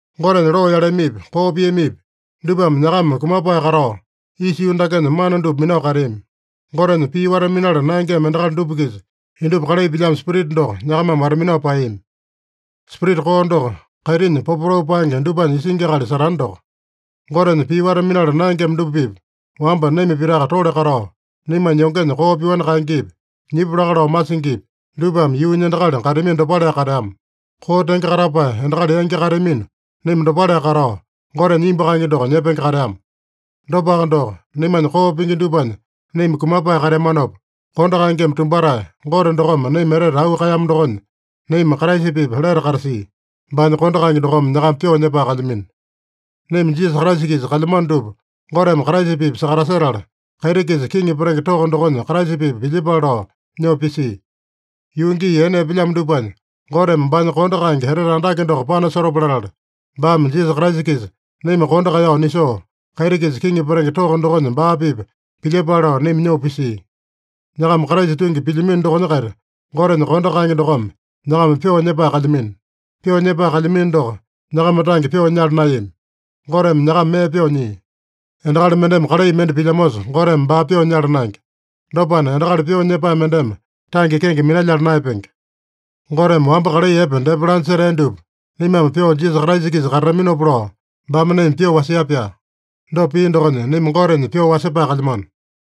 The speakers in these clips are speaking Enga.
Gotenya loo yaleamipi, koo piamipi, dupame nyakama kumapae katao, isa yuu dakenya mana dupa minao kateami. Gotenya pii wata-minala naengema endakali dupa-kisa indupa kalai pilyamo spirita doko nyakamame wata-minao paeyami. Spirita koo doko, kaitinya popotau paenge dupanya isingi akali Satane doko. Gotenya pii wata-minala naengema dupa-pipa wamba naima pitaka tole katao, naimanya yongenya koo pyoani kaengepi, nyipu laka lao masingipi, dupame yuunya endakali kateamino dopaleaka kateama. Koo tenge katapae endakali yangi kateamino naima dopaleaka katao, Gotenya imbu kaenge doko nyepenge kateama. Dopaka doko, naimanya koo pingi dupanya naima kumapae kateamanopa, kondo kaengeme tumbatae Gote dokome naima etete auu kaeyamo dokonya, naima Kraisa-pipa lete katasia. (Baanya kondo kaenge dokome nyakama pyoo nyepae kalyamino.) Naima Jisasa Kraisa-kisa kalyamano dupa Goteme Kraisa-pipa sakatasetala, kaiti-kisa kiŋi petenge toko dokonya Kraisa-pipa pilyepale lao nyoo pisia. Yuu gii ene epelyamo dupanya Goteme baanya kondo kaenge etete andake doko panasotopa latala, baame Jisasa Kraisa-kisa naima kondo kaeyao nisoo, kaiti-kisa kiŋi petenge toko dokonya baa-pipa pilyepale lao naima nyoo pisia. Nyakama Kraisa tungi pilyamino dokonya-kaita, Gotenya kondo kaenge dokome nyakama pyoo nyepae kalyamino. Pyoo nyepae kalyamino doko, nyakama tange pyoo nyala naeyami. Goteme nyakama mee pyoo nyia. Endakali mendeme kalai mende pilyamosa Goteme baa pyoo nyala naenge. Dopana, endakali pyoo nyepae mendeme tange kenge minalyala naeyapenge. Goteme wamba kalai epe depa laanya setea dupa naimame pyoo Jisasa Kraisa-kisa katataminopa lao, baame naima pyoo wasia-pyaa. Dopa pia dokonya, naima Gotenya pyoo wasepae kalyamano.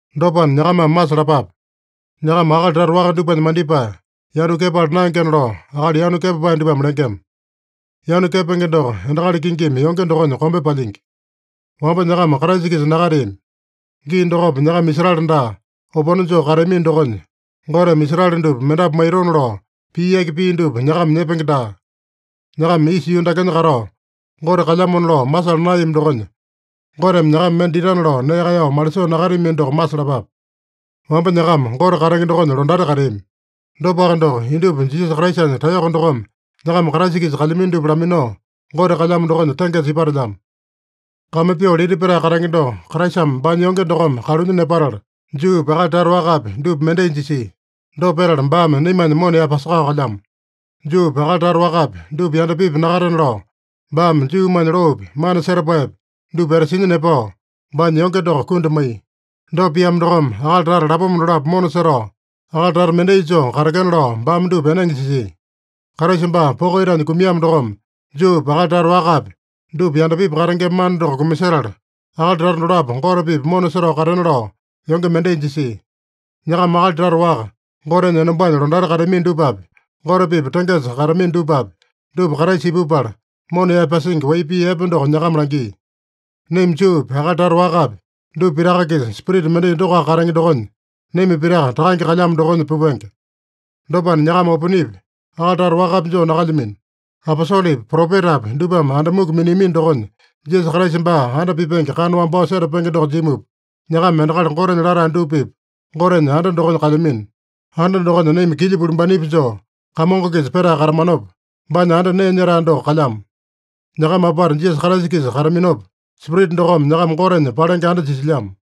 Dopana, nyakamame masalapape: Nyakama akali tata waka dupanya mandipae, yanu kepala naengena lao, akali yanu kepapae dupame lengema. Yanu kepenge doko endakali kingimi yonge dokonya kombe palyingi. Wamba nyakama Kraisa-kisa nakateami. Gii dokopa, nyakama Israele daa, opone joo kateamino dokonya, Goteme Israele dupa mendapu maitona lao pii yaki pia dupa nyakama nyepenge daa. Nyakama isa yuu dakenya katao, Gote kalyamona lao masala naeyami dokonya, Goteme nyakama mende ditana lao nee kaeyao malisoo nakateamino doko masalapape. Wamba nyakama Gote katenge dokonya londati kateami. Dopaka doko, indupa Jisasa Kraisanya taeyoko dokome nyakama Kraisa-kisa kalyamino dupa laminao, Gote kalyamo dokonya tengesa ipatelyamo. Kame pyoo lita petae katenge doko Kraisame baanya yonge dokome kalunya nepatala, Juupi, akali tata wakapi, dupa mendai jisia. Dopa petala, baame naimanya mona yaepasakao kalyamo. Juupi, akali tata wakapi, dupa yandapipi nakatena lao, baame Juumanya loopi, mana setapaepi, dupa etasinya nepao, baanya yonge doko kundi maiya. Dopa piamo dokome, akali tata lapoma dolapo mona setao, akali tata mendai joo katekena lao, baame dupa enenge jisia. Kraisa baa poko itanya kumiamo dokome, Juupi, akali tata wakapi, dupa yandapipi katengema mana doko kumasetala, akali tata dolapo Gote-pipa mona setao katena lao yonge mendai jisia. Nyakama akali tata waka, Gotenya enombanya londati kateamino dupapi, Gote-pipa tengesa kateamino dupapi, dupa Kraisa ipupala, mona yaepasingi wai pii epe doko nyakama langia. Naima Juupi, akali tata wakapi, dupa pitaka-kisa Spirita mendai dokoaka katenge dokonya, naima pitaka Takange kalyamo dokonya pupenge. Dopana nyakama oponepi, akali tata wakapi joo nakalyamino. Aposolepi, propetapi dupame anda muku miniamino dokonya, Jisasa Kraisa baa anda pipenge kana wambao setapenge doko jimupa, nyakama endakali Gotenya latae dupa-pipa Gotenya anda dokonya kalyamino. Anda dokonya naima kilya pulimbanepi joo Kamongo-kisa petae katamanopa, baanya anda nee nyetae doko kalyamo. Nyakama apata Jisasa Kraisa-kisa kataminopa, Spirita dokome nyakama Gotenya palenge anda jisilyamo.